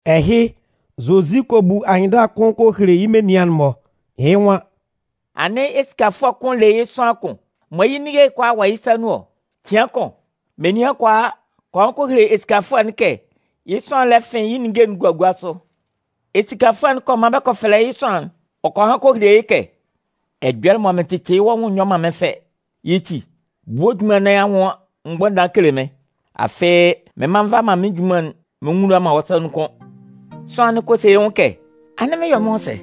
Ɛhɩ, Zozi kɔ bu anyɩnndala kʋn kɔ hele yɩ́ menian'n-mɔ. Yɩ́ nwan: “Anɩn esikafʋɛ bian kʋn le yɩ́ sʋanlan kʋn mɔ yɩ́ ninnge'n kʋalaa wɔ yɩ́ sa nun ɔ. Cɩan kʋn, menian kɔ a kɔ han kɔ hele esikafʋɛ'n kɛ yɩ́ sʋanlan'n lɛ fɩn yɩ́ ninnge'n gua gua sʋ. Esikafʋɛ'n kɔ man bɛ kɔ fɛlɛ yɩ́ sʋanlan'n. Ɔ kɔ han kɔ hele yɩ́ kɛ: ‘Ɛjɔlɛ mɔ mɩn tɩtɩ yɩ́ wɔ́ nwʋn'n nyɔ man mɩ́n fɛ. Yɩ́ ti, bu wɔ́ junman nɩn anwʋn mgbʋnndan kele mɩ́n. Afɩ mɩn mma nva man mɩ́n junman'n mɩn nwula man wɔ́ sa nun kʋ́n.’ “Sʋanlan'n kɔ se yɩ́ nwʋn kɛ: ‘Anɩn mɩn 'yɔ mɩ́n nwʋn sɛ?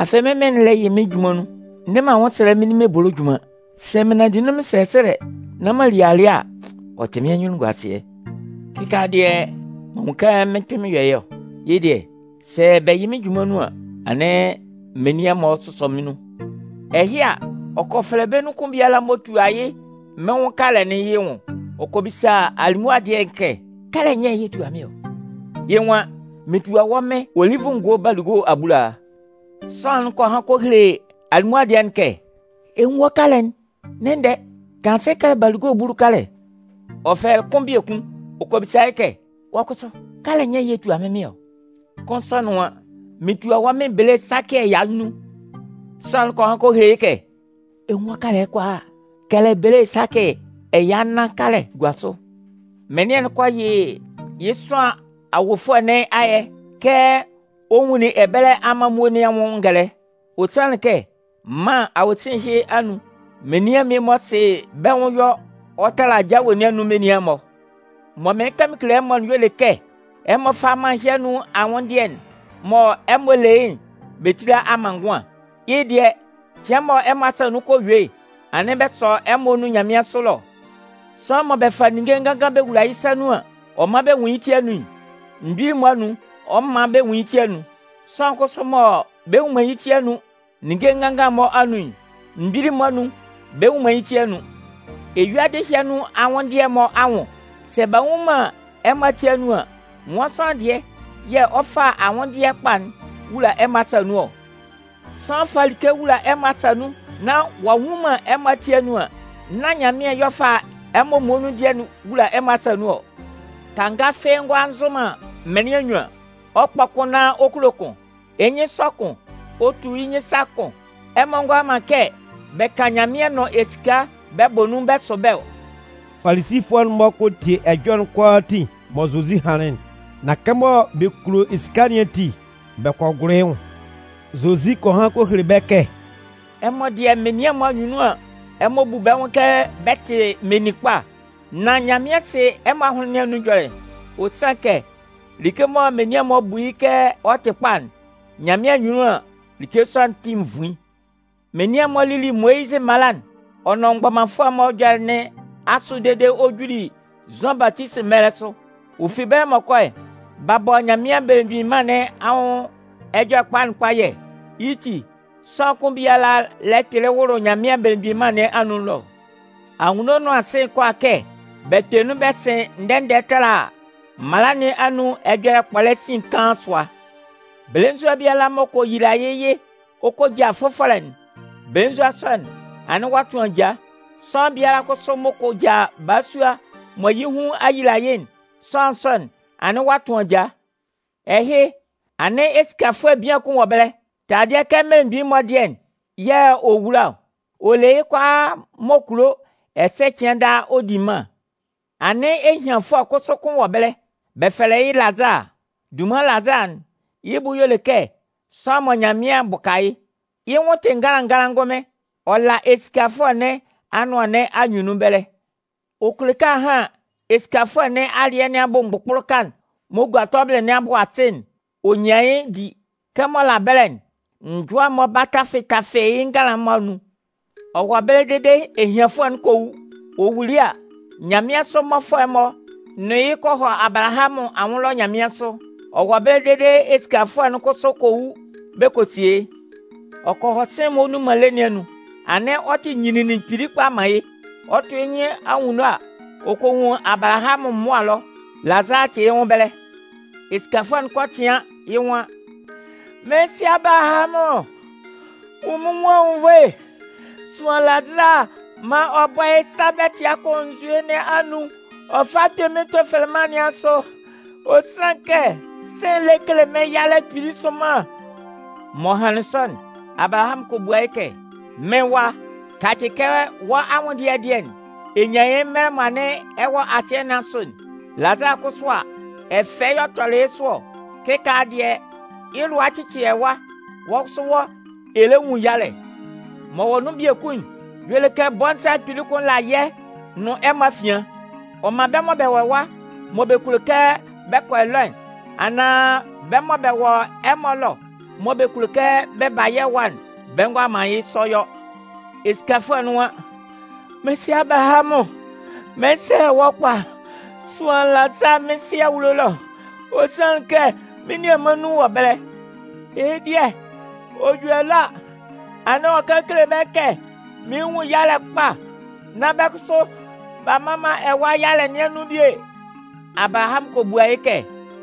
Afɩ mɩ́n mɩn'n lɛ yɩ mɩ́n junman nun. N ne man anwʋnsɛlɛ nán m'an li ebolo junman. Sɛ mɩn 'nanndɩ nun mɩn sɛsɛlɛ nán m'an li alɩɛ a, ɔ tɩ mɩ́n anyunnunguasɩɛ. Kɩkaala dɩɛ, m'an nwun kɛ mɩn 'kpɩn mɩn yɔ yɩ́'n! Yɩ́ dɩɛ, sɛ bɛ yɩ mɩ́n junman nun an, anɩn menian'n-mɔ sʋsɔ mɩ́n nun!’ “Ɛhɩ a, ɔ kɔ fɛfɛlɛ bɛ́ nun kʋn biala m'ɔ tua yɩ́ mɩn kalɛ'n yɩ́ nwʋn. Ɔ kɔ bisa alimʋa dɩɛ'n kɛ: ‘Kalɛ nyɛ yɛ̂ ɛ tua mɩ́n mɩn ɔ?’ “Yɩ́ nwan: ‘Mɩn tua wɔ́ mɩn olivʋ ngo balugo abulaa.’ “Sʋanlan'n kɔ han kɔ hele alimʋa dɩɛ'n kɛ: ‘Ɛ 'nwun wɔ́ kalɛ kalata'n. Ndɛ-ndɛ, tanlan asɩ kɛlɛ balugo bulu kalɛ.’ “Ɔ fɛlɛlɩ kʋn biekun, ɔ kɔ bisa yɩ́ kɛ: ‘Wɔ́ kʋsʋ, kalɛ nyɛ yɛ̂ ɛ tua mɩ́n mɩn ɔ?’ “Kʋn sɔ'n nwan: ‘Mɩn tua wɔ́ mɩn bele sakɩ ɛya nnun.’ “Sʋanlan'n kɔ han kɔ hele yɩ́ kɛ: ‘Ɛ 'nwun wɔ́ kalɛ kalata'n. Kɛlɛ bele sakɩ ɛya nnan kalɛ gua sʋ.’ “Mɩnlɩan'n kɔ yɩ yɩ́ sʋanlan awofʋɛ nɩn ayɛ kɛ ɔ nwunlin ɛbɛlɛ amanmuo nɩn anwʋn ngɛlɛ. Ɔ sanlɩn kɛ mân awosin ɛhɩ anun menian'n-mɔ sɩ bɛ́ nwʋn yɔ ɔ tala jawe nɩn anun menian'n-mɔ. Mɔ mɩɩn kan mɩn kele ɛmɔ'n y'ɔ le kɛ ɛmɔ fá mân ɛhɩ anun anwʋndɩɛ'n mɔ ɛmɔ le yɩ́'n bɛ tíla amanngʋan. Yɩ́ dɩɛ, cɩan mɔ ɛmɔ asa nun kɔ yue'n, anɩn bɛ sɔ ɛmɔ nun nyanmɩansʋ ɛlɔ. “Sʋanlan mɔ bɛ fa ninnge nganngan bɛ wula yɩ́ sa nun an, ɔ man bɛ nwun yɩ́ ti anun'n, mgbili'n-mɔ anun, ɔ 'man bɛ nwun yɩ́ ti anun. Sʋanlan kʋsʋ mɔ bɛ nnwun man yɩ́ ti anun ninnge nganngan'n-mɔ anun'n, mgbili'n-mɔ anun bɛ nnwun man yɩ́ ti anun. Eyuadɩ ɛhɩ anun anwʋndɩɛ'n-mɔ anwʋn, sɛ b'a nnwun man ɛmɔ ati anun an, nwan sʋanlan dɩɛ yɛ̂ ɔ 'fa anwʋndɩɛ kpa'n wula ɛmɔ asa nun ɔ? Sʋanlan fa like wula ɛmɔ asa nun nán ɔ'a nnwun man ɛmɔ ati anun an, nán Nyanmɩan yɛ̂ ɔ 'fa ɛmɔ muonun dɩɛ'n wula ɛmɔ asa nun ɔ. “Kanga fɩ́ɩ́ ngʋala nzʋ man mɩnlɩan nnyuan. Ɔ 'kpɔ kʋn nán ɔ kulo kʋn. Yɩ́ nyɩn 'sɔ kʋn, ɔ tu yɩ́ nyɩn sa kʋn. Ɛmɔ ngʋala man kɛ bɛ kan Nyanmɩan nʋn esika bɛ bɔ nun bɛ sʋ bɛ́ ɔ.” Falisifʋɛ'n-mɔ kɔ tie ɛjɔlɛ'n kʋalaatin mɔ Zozi hanlɩn'n. Nan kɛmɔ bɛ kulo esika nɩn ati, bɛ kɔ gʋlʋ yɩ́ nwʋn. Zozi kɔ han kɔ hele bɛ́ kɛ: “Ɛmɔ dɩɛ menian'n-mɔ anyunnun an, ɛmɔ bu bɛ́ nwʋn kɛ bɛ tɩ meninkpa. Nan Nyanmɩan sɩ ɛmɔ ahʋnlɩn nɩn anun ɛjɔlɛ. Ɔ sanlɩn kɛ like mɔ menian'n-mɔ bu yɩ́ kɛ ɔ tɩ kpa'n, Nyanmɩan anyunnun an, like sɔ'n tɩ nvuin. “Menian'n-mɔ lili Moyizɩ mala'n ɔ nʋn mgbɔmanfʋɛ'n-mɔ ɛjɔlɛ nɩn asʋ dede ɔ juli Zʋan Batisi mɛlɛ sʋ. Ɔ fi ɛbɛlɛ m'ɔ kɔ'n, b'a bɔ Nyanmɩan Belemgbin Mân nɩn anwʋn Ɛjɔlɛkpa'n kpayɛ. Yɩ́ ti, sʋanlan kʋn biala lɛ kpɩlɩ wʋlʋ Nyanmɩan belemgbin mân nɩn anun ɛlɔ. Anwunno nʋn asɩ'n kʋala kɛ bɛ kpɛ nun bɛ sɩn ndɛ-ndɛ tala mala nɩn anun ɛjɔlɛ kpɔlɛ sin kaan sʋa. “Belenzua biala m'ɔ kɔ yila yɩ́ yɩ ɔ kɔ ja fʋfɔlɛ'n, belenzua sɔ'n, anɩn ɔ'a tʋn aja. Sʋanlan biala kʋsʋ m'ɔ kɔ ja balasua mɔ yɩ́ hun a yila yɩ́'n, sʋanlan sɔ'n, anɩn ɔ'a tʋn ajaa. “Ɛhɩ, anɩn esikafʋɛ bian kʋn wɔ ɛbɛlɛ. Taladɩɛ kɛ mmelemgbin'n-mɔ dɩɛ'n yɛ̂ anɩn ɔ wula ɔ. Ɔ le yɩ́ kʋalaa m'ɔ kulo ɛsɛ cɩan daa ɔ di mân. Anɩn ehianfʋɛ kʋsʋ kʋn wɔ ɛbɛlɛ. Bɛ fɛlɛ yɩ́ Lazaa. (Dunman Lazaa'n, yɩ́ bʋ y'ɔ le kɛ sʋanlan mɔ Nyanmɩan bʋka yɩ́.) Yɩ́ nwʋn'n tɩ nganlan nganlan ngʋnmɩn. Ɔ la esikafʋɛ nɩn awulo nɩn anʋan nɩn anyunnun ɛbɛlɛ. Ɔ kulo kɛ ahan esikafʋɛ nɩn alɩɛ nɩn abʋ mgbʋkpʋlʋka'n m'ɔ gua tɔbɩlɩ nɩn abʋ asɩ'n, ɔ nyan yɩ́ di. Kɛmɔ ɔ la ɛbɛlɛ'n, njʋa'n-mɔ ba bɛ tafɩ tafɩ yɩ́ nganlan'n-mɔ anun. “Ɔ wɔ ɛbɛlɛ dede ehianfʋɛ'n kɔ wu. Ɔ wuli a, nyanmɩansʋ mmɔfʋɛ'n-mɔ nʋn yɩ́ kɔ hɔ Abalahamʋn anwʋn ɛlɔ nyanmɩansʋ. Ɔ wɔ ɛbɛlɛ dede esikafʋɛ'n kʋsʋ kɔ wu bɛ kɔ sie yɩ́. Ɔ kɔ hɔ sɩ̂n'n m'ɔ le man ayuelɩɛ nɩn anun, anɩn ɔ tɩ nyinlinlin kpili kpa man yɩ́. Ɔ 'tʋ yɩ́ nyɩn anwunno a, ɔ kɔ nwun Abalahamʋn mʋa ɛlɔ, Lazaa tɩ yɩ́ nwʋn ɛbɛlɛ. Esikafʋɛ'n kɔ tɩan, yɩ́ nwan: ‘Mɩ́n sɩ Abalahamʋn, nwun mɩ́n nwʋn anwunnvoe. Sʋan Lazaa maan ɔ bɔ́ yɩ́ sa bɛtɩa kʋn nzue nɩn anun ɔ fá kpɩ́n mɩ́n tofeleman nɩn asʋ. Ɔ sanlɩn kɛ sɩ̂n'n lɛ kele mɩ́n yalɛ kpili sʋnman.’ “M'ɔ hanlɩn sɔ'n, Abalahamʋn kɔ bua yɩ́ kɛ: ‘Mɩ́n wa, kacɩ kɛ wɔ́ anwʋndɩɛ dɩɛ'n, ɛ nyanlɩn yɩ́ mɛlɛ mɔ anɩn ɛ wɔ asɩɛ nɩn asʋ'n. Lazaa kʋsʋ a, ɛfɛ yɛ̂ ɔ tɔlɩ yɩ́ sʋ ɔ. Kɩkaala dɩɛ, yɩ́ lʋa a cɩcɩ ɛwa. Wɔ́ kʋsʋ wɔ́, ɛ lɛ nwun yalɛ. M'ɔ wɔ nun biekun'n y'ɔ le kɛ bɔnza kpili kʋn la yɛ́ nʋn ɛmɔ afian. Ɔ man bɛ́ mɔ bɛ wɔ ɛwa mɔ bɛ kulo kɛ bɛ kɔ ɛlɔ'n, anaan bɛ́ mɔ bɛ wɔ ɛmɔ ɛlɔ mɔ bɛ kulo kɛ bɛ ba yɛ́ ɛwa'n, bɛ ngʋala man yɩ́ sɔ yɔ.’ “Esikafʋɛ'n nwan: ‘Mɩ́n sɩ Abalahamʋn, mɩn 'sɛlɛ wɔ́ kpa, sʋan Lazaa mɩ́n sɩ awulo ɛlɔ, ɔ sanlɩn kɛ mɩ́n nianman nnun wɔ ɛbɛlɛ. Yɩ́ dɩɛ ɔ ju ɛlɔ a, anɩn ɔ kan kele bɛ́ kɛ mɩɩn nwun yalɛ kpa, nán bɛ́ kʋsʋ, b'a mma man ɛwa yalɛ nɩn anun bie.’ “Abalahamʋn kɔ bua yɩ́ kɛ: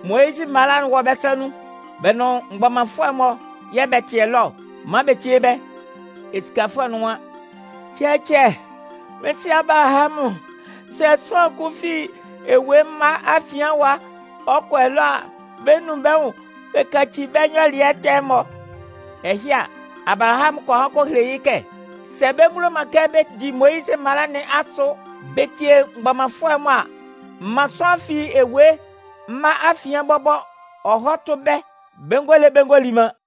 ‘Moyizɩ mala'n wɔ bɛ́ sa nun, bɛ nʋn mgbɔmanfʋɛ'n-mɔ yɛ̂ bɛ tɩ ɛlɔ ɔ. Man bɛ tíe bɛ́!’ “Esikafʋɛ'n nwan: ‘Cɛcɛ, mɩ́n sɩ Abalahamʋn, sɛ sʋanlan kʋn fi ewue mma afian ɛwa ɔ kɔ ɛlɔ a, bɛ 'nun bɛ́ nwʋn bɛ yaci bɛ́ nyɔlɩɛ ɛtɛ'n-mɔ.’ “Ɛhɩ a, Abalahamʋn kɔ han kɔ hele yɩ́ kɛ: ‘Sɛ bɛ ngulo man kɛ bɛ di Moyizɩ mala nɩn asʋ bɛ tie mgbɔmanfʋɛ'n-mɔ a, man sʋanlan fi ewue mma afian bɔbɔ ɔ hɔ́ tʋ́ bɛ́, bɛ ngɔ le bɛ ngɔ li man.’”